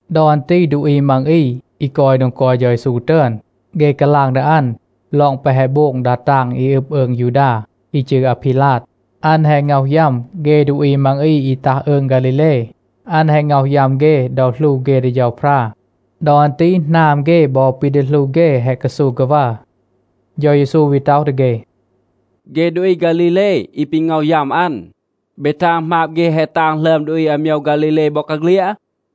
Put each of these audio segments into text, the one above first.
ดอ อัน ตี ดูอี มัง อี, อี กอย โดง กอย เฌา เยซู ตึอน, เฆ กาลาง ดี อัน ลอง แปะ แฮะ โบง ดา ตาง อี อึบ อืง ยูดา, อี จืร อาพีลาด. อัน แฮะ ง็อห ยัม เฆ ดูอี มัง อี อี ตัห อืง ฆาลีเล. อัน แฮะ ง็อห ยัม เฆ ดอ หลู เฆ ดี เฌาพรา. ดอ อัน ตี หนาม เฆ บอ ปี ดี หลู เฆ แฮะ กาซู กาวัร. เฌา เยซู วี ต็อห ดี เฆ, “เฆ ดูอี ฆาลีเล, อี ปี ง็อห ยัม อัน, เบ ทาง หมาบ เฆ แฮะ ตาง หลึอม ดูอี อาโมยว ฆาลีเล บอกาเฆลียด?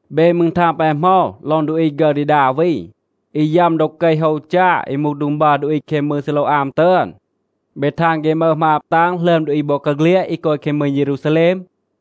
เบ มืร ทาง ปาย เหมา ลอง ดูอี ฆึร ดี ดา วี, อี ยัม ดอ เกห โฮว จา อี มูห โดง บัร ดูอี แคง มืง ซีโลวอาม ตึอน? เบ ทาง เฆ มึห หมาบ ตาง หลึอม ดูอี บอกาเฆลียด อี กอย แคง มืง เยรูซาแลม?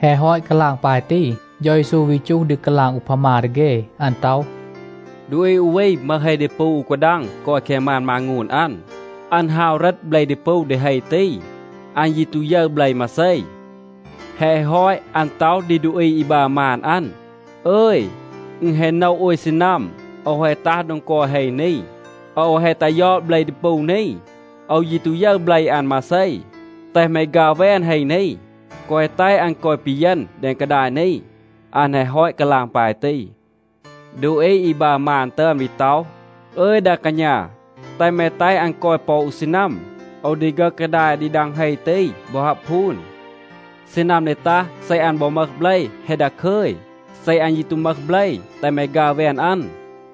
แฮะ ฮอต กาลาง ปาย ตี, เฌา เยซู วี จูห ดี กาลาง อูพามา ดี เฆ. อัน ต็อห, “ดูอี อู วี มึห เฮ ดีปู อู กาดัง กอย แคง มาน มางูน อัน. อัน ฮาว เหรต เบล ดีปู ดี เฮ ตี. อัน ยี ตู ยึร เบล มาเซ. แฮะ ฮอต, อัน ต็อห ดี ดูอี อี บัร มาน อัน, ‘อึย, อึณ แฮะ โนะ โอย ซีนัม โอว แฮะ ตัห โดง กอย เฮ นี. โอว แฮะ ตัห ยอด เบล ดีปู นี. โอว ยี ตู ยึร เบล อัน มาเซ. แตห แม ฆัร แวน เฮ นี. แกวะ แตห อัน กอย ปีเยณ แดง กาดาย นี.’ อัน แฮะ ฮอต กาลาง ปาย ตี, ดูอี อี บัร มาน ตึอน วี ต็อห, ‘อึย ดา กาณา, แตห แม แตห อัน กอย ปอ อู ซีนัม. โอว ดี ฆึห กาดาย ดี ดัง เฮ ตี บอ ฮับ พูน. ซีนัม ดี ตัห, เซ อัน บอ มึห เบล, แฮะ ดาคึย. เซ อัน ยี ตู มึห เบล, แตห แม ฆัร แวน อัน.’”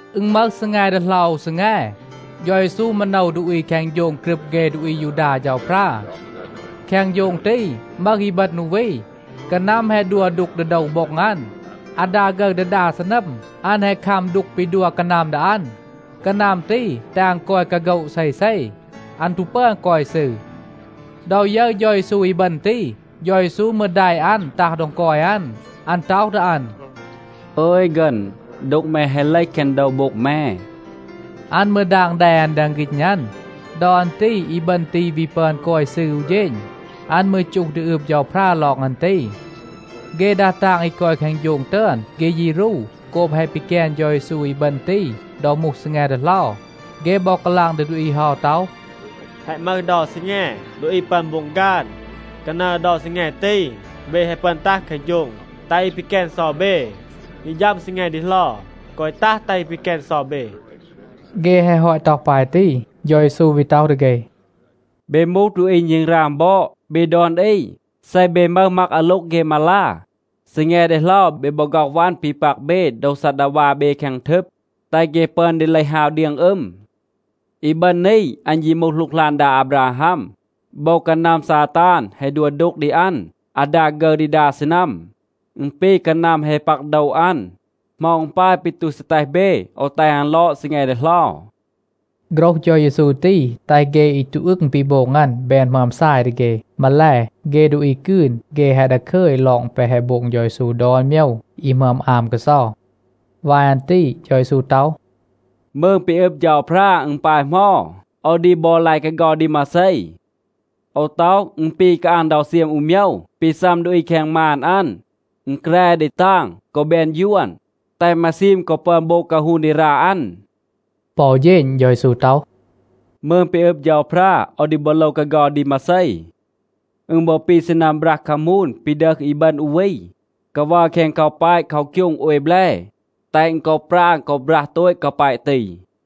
อึณ มึห ซีแง ดีเหลา อู ซีแง, เฌา เยซู มาโนว ดูอี แคง โฌง กรึบ เฆ ดูอี อายูดา เฌาพรา. แคง โฌง ตี มึห อีบึณ อู วี. กานัม แฮะ ดัว ดูก ดี โดว โบ็ง อัน. อาดา ฆึร ดี ดา ซีนัม อัน แฮะ คัม ดูก ปี ดัว กานัม ดี อัน. กานัม ตี แตห อัน กอย กาโฆะ เซเซ. อัน ตู ปึอน กอย ซืร. ดอ ยึร เฌา เยซู อีบึณ ตี, เฌา เยซู มืร แดะ อัน ตัห โดง กอย อัน. อัน ต็อห ดี อัน, “อึย ฆึณ, ดูก แม แฮะ เลห แคง โดว โบ็ง แม.” อัน มืร ดาง แด อัน แดง ฆีณ อัน. ดอ อัน ตี อีบึณ ตี วี ปึอน กอย ซืร อู เฌณ. อัน มืร จูห ดี อืบ เฌาพรา ลอง อัน ตี. เฆ ดา ตาง อี กอย แคง โฌง ตึอน, เฆ ยี รู โกบ แฮะ ปีแกน เฌา เยซู อีบึณ ตี ดอ มูห ซีแง ดีเหลา. เฆ บอ กาลาง ดี ดูอี เฮา ต็อห, “แฮะ มึห เดา ซีแง, ดูอี ปึอน โบง ฆาน. กานัร เดา ซีแง ตี, เบ แฮะ ปึอน ตัห แคง โฌง, แตห อี ปีแกน เซา เบ. ฮี ฌัม ซีแง ดีเหลา, แกวะ ตัห แตห อี ปีแกน เซา เบ.” เฆ แฮะ ฮอต ต็อห ปาย ตี, เฌา เยซู วี ต็อห ดี เฆ, “เบ มูห ดูอี ณึงราง บอด. เบ ดอน อี, เซ เบ มึห มัก อาโล็ง เฆ มาลา, ซีแง ดีเหลา เบ บอ ฆ็อห วัน ปี ปัก เบ โดว ซัดดาวา เบ แคง ทึบ, แตห เฆ ปึอน ดี เลห ฮาว เดียง อึม. อีบึณ นี, อัน ยี มูห หลูกหลาน ดา อาบราฮัม. โบว กานัม ซาตาน แฮะ ดัว ดูก ดี อัน อาดา ฆึร ดี ดา ซีนัม. อึณ ปี กานัม แฮะ ปัก โดว อัน. เหมา อึณ ปาย ปี ตู ซี แตห เบ โอว แตห อัน ลอด ซีแง ดีเหลา?” โฆรห เฌา เยซู ตี แตห เฆ อี ตู อึง ปี โบง อัน แบน หมึอม ซาย ดี เฆ. มาแล, เฆ ดูอี กืน, เฆ แฮะ ดาคึย ลอง แปะ แฮะ โบง เฌา เยซู ดอน โมยว อี หมึอม อาม กาเซา. วาย อัน ตี เฌา เยซู ต็อห, “มืง ปี อึบ เฌาพรา, อึณ ปาย เหมา? โอว ดี บอ ลาย กาเฆา ดี มาเซ? โอว ต็อห, อึณ ปี กาอาง เดา เซียม อู โมยว ปี ซัม ดูอี แคง มาน อัน. อึณ แกร ดี ตาง, กอ แบน ยวน, แตห มาซีม กอ ปึอน โบง กาฮูน ดี รา อัน.” ปอ อู เฌณ เฌา เยซู ต็อห, “มืง ปี อึบ เฌาพรา, โอว ดี บอ โลว กาเฆา ดี มาเซ? อึณ บอ ปี ซีนัม บรัห คามูน ปี ดึห อีบึณ อู วี, กาวัร แคง กาแปะ เคาคยูง โอย แบล, แตห อึณ กอ ปราง กอ บรัห โตต กาแปะ ตี.”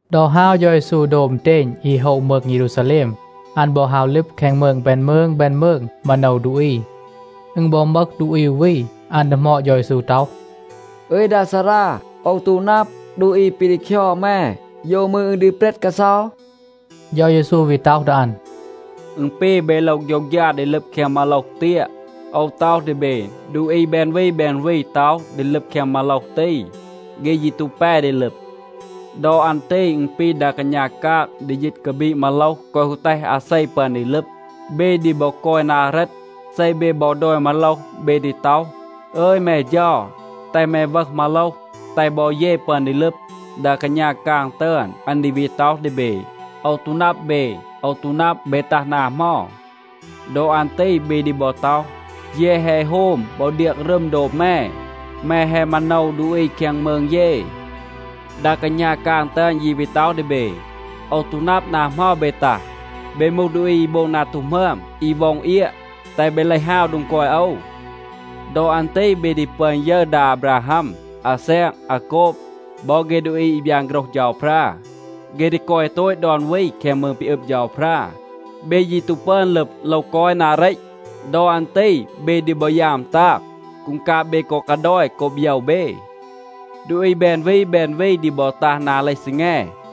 ดอ ฮาว เฌา เยซู โดบ อึณเตณ อี โฮะ มืง เยรูซาแลม, อัน บอ ฮาว ลึบ แคง มืง แบน มืง แบน มืง, มาโนว ดูอี. อึณ บอ มึห ดูอี อู วี, อัน ดีหมอด เฌา เยซู ต็อห, “อึย ดา ซารา, โอว ตู นับ, ดูอี ปี ดี คยอด แม, โยว มืร อึณ ดี เปรต กาเซา?” เฌา เยซู วี ต็อห ดี อัน, “อึณ ปี เบ โลว โฆยวฆยา ดี ลึบ แคง มาโลห เตียะ. โอว ต็อห ดี เบ, ดูอี แบน วี แบน วี ต็อห ดี ลึบ แคง มาโลห ตี. เฆ ยี ตู แป ดี ลึบ. ดอ อัน ตี อึณ ปี ดา กาณา กาง ดี ยีต กาบีด มาโลห แกวะ ฮู แตห อาเซ ปึอน ดี ลึบ. เบ ดี บอ กอย นา เรต. เซ เบ บอ ดอย มาโลห, เบ ดี ต็อห, ‘อึย แม เฌา, แตห แม วึห มาโลห, แตห บอ เย ปึอน ดี ลึบ,’ ดา กาณา กาง ตึอน, อัน ดี วี ต็อห ดี เบ, ‘โอว ตู นับ เบ. โอว ตู นับ, เบ ตัห นา เหมา.’ ดอ อัน ตี เบ ดี บอ ต็อห, ‘เย แฮะ โฮม บอ เดียง รึม โดบ แม. แม แฮะ มาโนว ดูอี แคง มืง เย.’ ดา กาณา กาง ตึอน ยี วี ต็อห ดี เบ, ‘โอว ตู นับ นา เหมา เบ ตัห. เบ มูห ดูอี อี โบง นา ตู หมึอม, อี ว็อง เอียะ, แตห เบ เลห ฮาว โดง กอย โอว.’ ดอ อัน ตี เบ ดี ปึอน ยึร ดา อาบราฮัม, อาแซก, อาโกบ, บอ เฆ ดูอี อี บยาน โฆรห เฌาพรา. เฆ ดี กอย โตต ดอน วี แคง มืง ปี อึบ เฌาพรา. เบ ยี ตู ปึอน ลึบ, โลว กอย นา เรต. ดอ อัน ตี เบ ดี บอ ยาม ตาง. กูงกาบ เบ กอ กาดอย โกบ โยว เบ. ดูอี แบน วี แบน วี ดี บอ ตัห นา เลห ซีแง,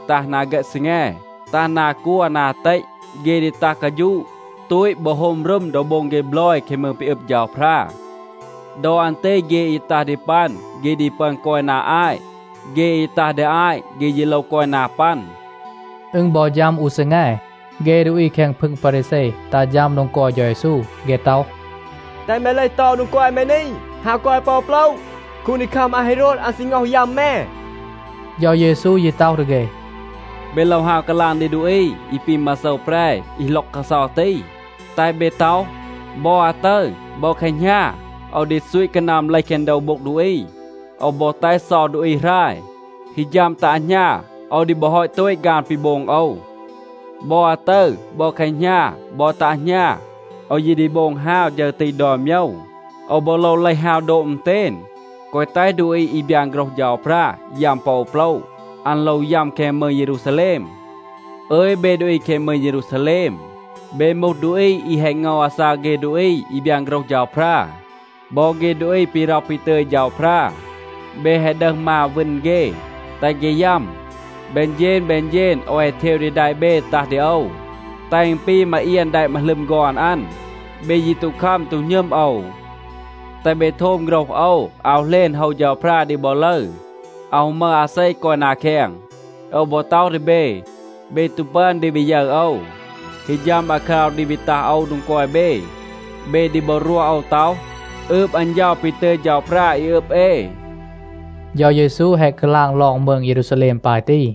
ตัห นา เฆต ซีแง, ตัห นา กัว, นา เตต. เฆ ดี ตัห กาฌูะ, ตูต บอ โฮม รึม ดอ โบง เฆ บลอย แคง มืง ปี อึบ เฌาพรา. ดอ อัน ตี เฆ อี ตัห ดี ปัน, เฆ ดี ปึอน กอย นา อาต. เฆ อี ตัห ดี อาต, เฆ ยี โลว กอย นา ปัน.” อึณ บอ ฌัม อู ซีแง, เฆ ดูอี แคง พึง พารีแซ ตัห ฌัม โดง กอย เฌา เยซู. เฆ ต็อห, “แตห แม เลห เตา โดง กอย แม นี, ฮาว กอย ปอ โปละ. คูนดีคัม อาเฮโรด, อัน ซี ง็อห ยัม แม.” เฌา เยซู ยี ต็อห ดี เฆ, “เบ โลว ฮาว กาลาง ดี ดูอี อี ปี มาโซว แปร อี หล็อก กาเซา ตี. แตห เบ ต็อห, ‘บอ อาตึร, บอ แคหณา โอว ดี ซูต กานัม เลห แคง โดว โบ็ง ดูอี. โอว บอ แตห เซา ดูอี หราย. ฮี ฌัม ตัะ หณา, โอว ดี บอ ฮอต โตต ฆาน ปี โบง โอว.’ บอ อาตึร, บอ แคหณา, บอ ตัะ หณา, โอว ยี ดี โบง ฮาว ฌึร ตี ดอน โมยว. โอว บอ โลว เลห ฮาว โดบ อึณเตณ, แกวะ แตห ดูอี อี บยาน โฆรห เฌาพรา ยัม ปอ โปละ. อัน โลว ยัม แคง มืง เยรูซาแลม. อึย, เบ ดูอี แคง มืง เยรูซาแลม, เบ มูห ดูอี อี แฮะ ง็อห อาซาก เฆ ดูอี อี บยาน โฆรห เฌาพรา. บอ เฆ ดูอี ปี ร็อห ปี ตึย เฌาพรา, เบ แฮะ ดึห มาว, วึณ เฆ, แตห เฆ ยัม. แบน เฌณ แบน เฌณ โอว แฮะ เทว ดี แดะ เบ ตัห ดี โอว, แตห อึณ ปี มาเอียน แดะ มาหลึม ฆอน อัน. เบ ยี ตู คัม, ตู หณึม โอว. แตห เบ โทม โฆรห โอว, อาว เหลณ โฮว เฌาพรา ดี บอ ลึร. อาว ฮู มึห อาเซ กอย นา แคง. โอว บอ ต็อห ดี เบ, เบ ตู ปึอน ดี วี ยึร โอว. ฮี ฌัม อาคราว ดี วี ตัห โอว โดง กอย เบ, เบ ดี บอ รวห โอว ต็อห, ‘อืบ อัน เฌา ปี ตึย เฌาพรา อี อึบ เอ.’” เฌา เยซู แฮะ กาลาง ลอง มืง เยรูซาแลม ปาย ตี.